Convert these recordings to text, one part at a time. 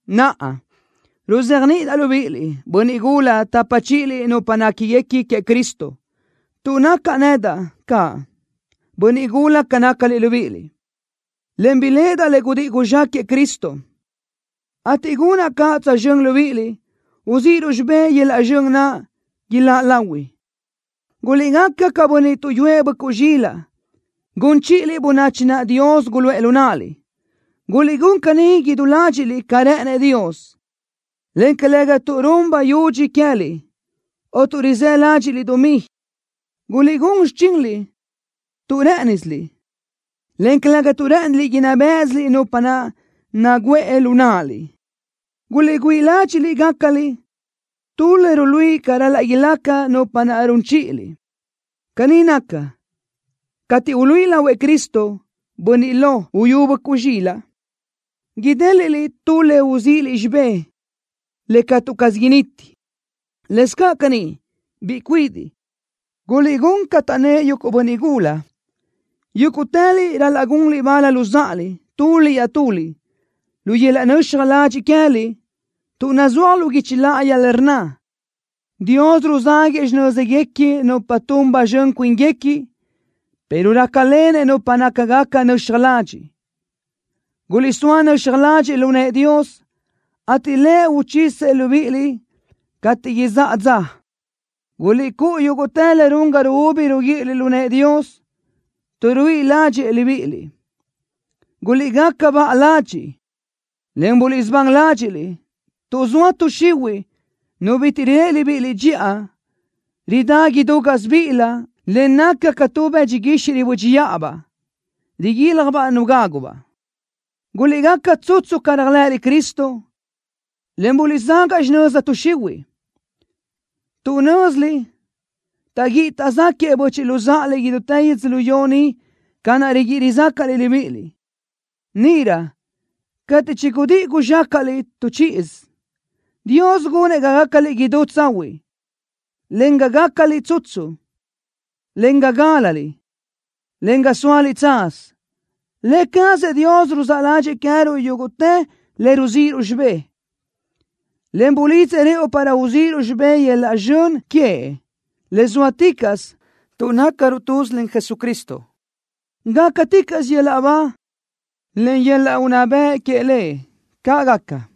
Naʼa, ruzéajniʼidaʼ libíʼiliʼ, bönniʼ gula tapa chíʼiliʼ nupa néquiguequi queëʼ Cristo, tuʼ nacaʼ nedaʼ caʼ bönniʼ gula ca nácaliʼ libíʼiliʼ, en biléʼedaʼ le gudíʼi guzxáquëʼë Cristo, ateʼ gunaʼ caʼ tsözxö́n libíʼiliʼ, uzíʼiruʼ xibé yöl-laʼ zxön naʼ iláʼ lahui. Guliʼgaca ca bönniʼ tuʼyúëʼ böʼcuʼ zxilaʼ, gun chíʼiliʼ bönachi naʼ Dios guluʼë lu náʼaliʼ. Guliʼgún caní idú ládxiʼliʼ ca rë́ʼënëʼ Dios, en calëga tuʼ run bayudxi queë́liʼ, o tuʼ rizë́ ládxiʼliʼ dumí. Guliʼgún xichinliʼ tu rë́ʼënisiliʼ, en calëga tuʼ rë́ʼëniliʼ inná béʼesiliʼ nupa naʼ naguʼë lu náʼaliʼ. Guliʼgüíʼ ládxiʼliʼ gácaliʼ tu le ruluíʼi ca ral-laʼ ilaca nupa naʼ run chíʼiliʼ. Caní naca, cateʼ uluíʼi lahuëʼ Cristo, bönniʼ lo uyú böʼcuʼ zxilaʼ, idéliʼliʼ tu le uzíʼiliʼ xibé le catu caz initi. Lëscaʼ caní, biʼi cuidiʼ, guliʼgún ca taʼnnë́ʼ yuguʼ bönniʼ gula. Yúguʼtëliʼ ral-laʼ gunliʼ bal luzáʼaliʼ, tuliʼ iaʼtuliʼ, lu yöl-laʼ nöxaj ladxiʼ queë́liʼ, tuʼ nazúaj lu guichi láʼayi le rnna: Dios ruzáguëʼë xinö́zguequi nupa tun ba zxön cuínguequi pero rácalenëʼ nupa nácagaca nöxaj ladxiʼ. Guliʼsóa nöxaj ladxiʼ lu nëʼë Dios, ateʼ Lëʼ uchisëʼ libíʼiliʼ cateʼ izáʼa dza. Guliʼcúʼu yúguʼtë le run ga ruúbi ruguíʼiliʼ lu nëʼë Dios, tuʼ ruíʼi ládxëʼë libíʼiliʼ. Guliʼgaca baʼa ladxiʼ, en buliʼsubán ládxiʼliʼ, tuʼ zoa tuʼ xihuiʼ, nu bitiʼ riléʼe libíʼiliʼ dxiʼa, ridá idú gásibiʼilö, en naca ca tubaʼ bëdxi guixiʼ ribö́dxiʼabaʼ, riguiljbaʼ nu gágubaʼ. Guliʼgaca tsutsu ca réajlëʼëliʼ Cristo, en guliʼzágaʼ xinöza tuʼ xihuiʼ, tuʼ nö́ziliʼ taʼguíʼi taʼzáquëʼë böchiʼ luzáʼaliʼ idútë yödzölió ni ca naʼ riguíʼi rizácaʼliʼ libíʼiliʼ. Níʼirö cateʼ chigudíʼi guzxácaʼliʼ tu chíʼisö, Dios gunëʼ ga gácaliʼ idú tsahuiʼ, en ga gácaliʼ tsutsu, en ga gálaliʼ, en ga sóaliʼ tsaz. Lë cazëʼ Dios ruzáʼ ládxëʼë queë́ruʼ yúguʼtë le ruzíʼiruʼ xibé, en bulidzëʼ rëʼu para uzíʼiruʼ xibé yöl-laʼ zxön queëʼ le zóaticaʼsö tuʼ nácaruʼ tuz len Jesucristo. ¡Gácaticaʼsö yöl-laʼ ba, en yöl-laʼ unná bëʼ queëʼ Lëʼ! ¡Caʼ gaca!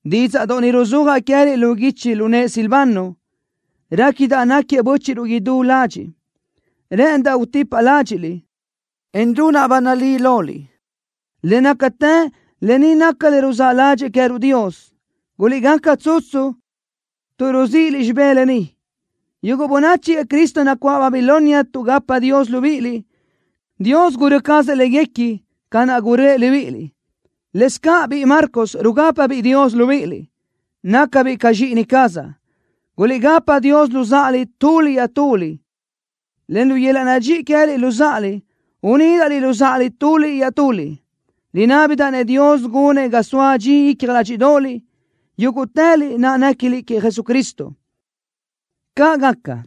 Dídzaʼdoʼ ni ruzúajaʼ queë́liʼ lu guichi lu nëʼë Silvano. Réquidaʼ náquiëʼ bö́chiʼruʼ idú ladxiʼ. Rë́ʼëndaʼ utipaʼ ládxiʼliʼ, en runaʼ ba nalí loliʼ, le nácatë lë ni naca le ruzáʼ ládxëʼë queë́ruʼ Dios. ¡Guliʼgaca tsutsu tuʼ ruzíʼiliʼ xibé lë ni! Yuguʼ bönachi queëʼ Cristo nacuáʼ Babilonia tuʼgapa Dios libíʼiliʼ. Dios gurö́ cazëʼ léguequi ca naʼ gurö́ëʼ libíʼiliʼ. Lëscaʼ biʼi Marcos rugápabiʼ Dios libíʼiliʼ. Nácabiʼ ca zxíʼini cazaʼ. Guliʼgapa Dios luzáʼaliʼ tuliʼ iaʼtuliʼ, en lu yöl-laʼ nadxíʼi queë́liʼ luzáʼaliʼ unídaʼliʼ luzáʼaliʼ tuliʼ iaʼtuliʼ. Rinábidaʼ-nëʼ Dios gunëʼ ga soa dxi icja ládxiʼdoʼoliʼ, yúguʼtëliʼ naʼ néquiliʼ queëʼ Jesucristo. ¡Caʼ gaca!